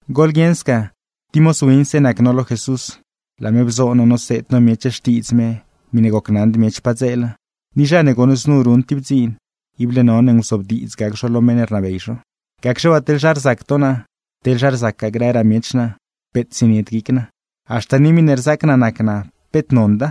Goḻguieṉ sca tib moz winse nac no lo Jesús, laa me bzoo no noseed no miech xtiidz me miṉe gocnaṉd miech padzeela. Ni zha ne goṉ znu ruṉ tib dziin, ible none nguzobdiidz gac zho lo meṉ ne rnabey zho. Gacxe waa teḻ zha rzac to naa, teḻ zha rzacgaa grëraa miech naa, peet zienied guic naa. Haxta ni miṉe rzaac naa nac naa, peet nonda,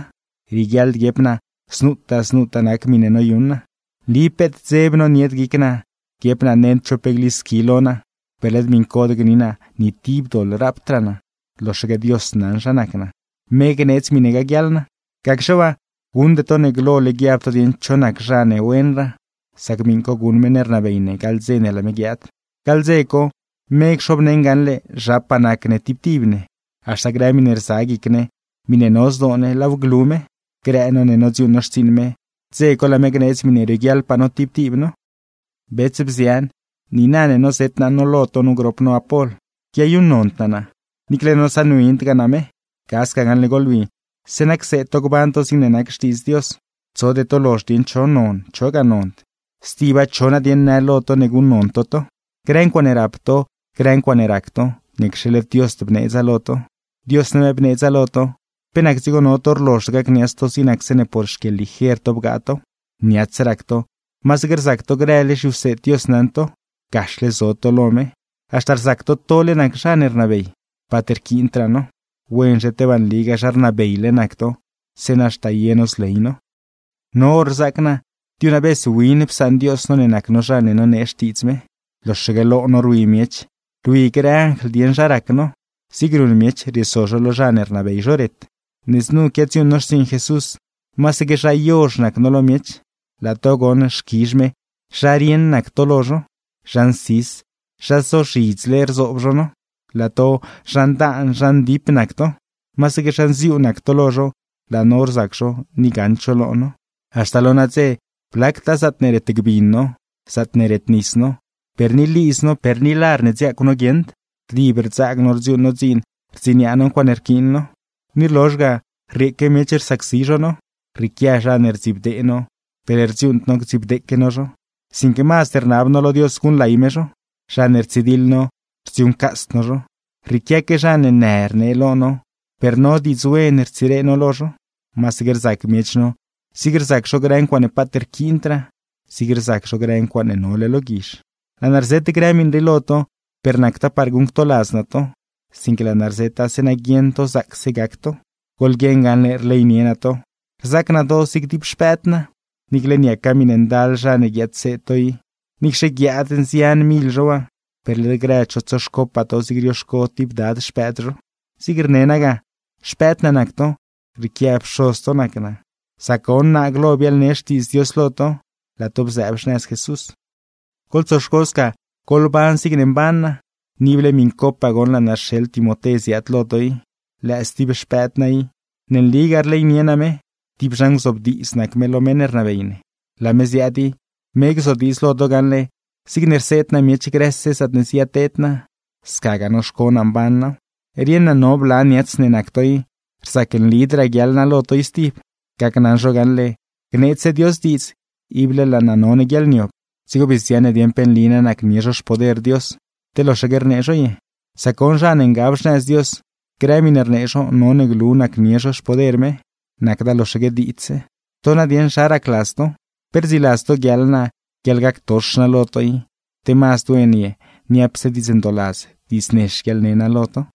rieguiaḻd guiep naa znutaa znutaa nac miṉe noyuṉ naa. Nli peet dzeb nonied guic naa guiep naa nend cho pe glisqui lo naa, per led miṉcod gni naa ni tib doḻ rapdraa naa; loxaque Dios naṉ zha nac naa, me gneedz miṉe gaguiaḻ naa. Gacxe waa, guṉde to ne glole to guiab dieṉ cho nac zha ne wenraa; sac miṉ co guṉ meṉ ne rnabey ne gaḻ dze ne laa me guiaad. Gaḻ dze co, me cxobneṉ gaṉle zhapaa nac ne tib tib ne, haxta grë miṉe rza guic ne, miṉe no zdoo ne, laaw glu me; grë no ne nodziuuṉ no xtsiiṉ me, dze co laa me gneedz miṉe rioguiaḻpaa no tib tib no. Bets, bzian, niina ne nozet naa no lo to nu grop no Apol, quiayuṉnond naa naa, niicle nosaṉwindgaa naa me. Ga sca gaṉle goḻwi, zeeṉa cseed to gban to zigne nac Xtiidz Dios, tsode to lozhd dieṉ cho non, chogaa nond. Stiba, ¿cho nadieṉ në lo to ne guṉnon to to? Grë ncuaaṉe rap to, grë ncuaaṉe rac to, ¿niacxe led Diosd bneedza lo to? Dios name bneedza lo to, ¿pe nac dzigo no to rlozhd gacniats to zig nac zeeṉe por xquieḻliger to bgaa tow? Niats rac to, masaque rzac to grële zhiwseed Dios naṉ to, gaxle zo to lo me, haxta rzac to tole nac zha rnabey, paat rquiindraa no. Wenzhe tebaa nligaa zha rnabeyle nac to, zeeṉa haxta ye no zley no. No hor rzaac naa, diunavez win psaṉ Dios no ne nac no zha ne nonee xtiidz me, loxaque lo no rwi miech, rwi grë anjl dieṉ zha rac no; zig ruṉ miech rieso zho lo zha ne rnabey zho ret. Ne znu quiadziuuṉ no xtsiiṉ Jesús, masaque zha yozh nac no lo miech, laa to goṉ xquizh me zha rieṉ nac to lo zho. Zha nsis, zha zozhidzle rzoob zho no, laa to zha ndaan, zha ndip nac to. Masaque zha nziuu nac to lo zho, laa no rzac zho ni gaṉd zho lo no. Haxta lo nadze blactaa zaatne retgbin no, zaatne retnis no, per ni lidz no, per ni lar ne dziaacw no guieṉd, rdib rdzaag no rdziuuṉ no dziin rdziniaa no ncuaaṉe rquiin no. Ni rlozh ga rrieeque miech rsacsi zho no. Rrieequia zha ne rdzibdee no, per rdziuuṉd no gdzibdeeque no zho, sinque mazd rnab no lo Dios guṉlay me zho; zha ne rtsidiḻ no, rdziuuṉcasd no zho. Rrieequia zha ne në rnee lo no, per no, diidz wen rtsire no lo zho. Masaque rzac miech no, zig rzac zho grë ncuaaṉe paat rquiindraa, zig rzac zho grë ncuaaṉe nole lo guizh. Laa naa rzet grë miṉ rii lo to, per nacda par guṉctoladz naa to, sinque laa naa rzeta zeeṉa guieṉ to zaacse gac to, goḻguieṉ gaṉle rleynie naa to, rzaac naa to zig tib xpëëd naa. Niicle niaca miṉe ndal zha ne guiadseed to i, niicxe guiaad nzian mil zho waa, per led grëd zho tsoxcopaa to zig rioxco tib dad xpëëd zho. Zigne rne naa ga, xpëëd naa nac to, rrieequia pxoz to nac naa, sac goṉ naa glo biaḻne xtiidz Dios lo to, laa to bzëëb xnëz Jesús. Goḻtsoxco sca, goḻban zigne mban naa. Ni ible miṉcopaa goṉ laa naa rxeḻ Timoté ziaad lo to i, lëë stib xpëëd naa i, ne nligaa rleynie naa me, tib zha nguzobdiidz nac me lo meṉ ne rnabey me. Laa me ziaad i, me gzodiidz lo to gaṉle zigne rseed naa miech grëse zaatne ziyateed naa, scagaa noxco naa mban naaw. Rieṉ naa no bla niats ne nac to i, rzac nlidraa guiaḻ naa lo to i stib. Gacnaṉ zho gaṉle, gneedzse Dios diidz, ible laa naa none guiaḻniob, dzigo bii zdziaṉ ne dieṉ pe nli na nacnie zho xpoder Dios, te loxaque rnee zho ye. Sac goṉ zha ne ngab xnëz Dios, grë miṉe rnee zho none glu nacnie zho xpoder me, nacda loxaque diidzse. ¿To nadieṉ zha racladz to? ¿Pe rdziladz to guiaḻ naa guiaḻgactox naa lo to i, te mazd wen ye niapse diidz ndooladz, diidz nex guiaḻne naa lo to?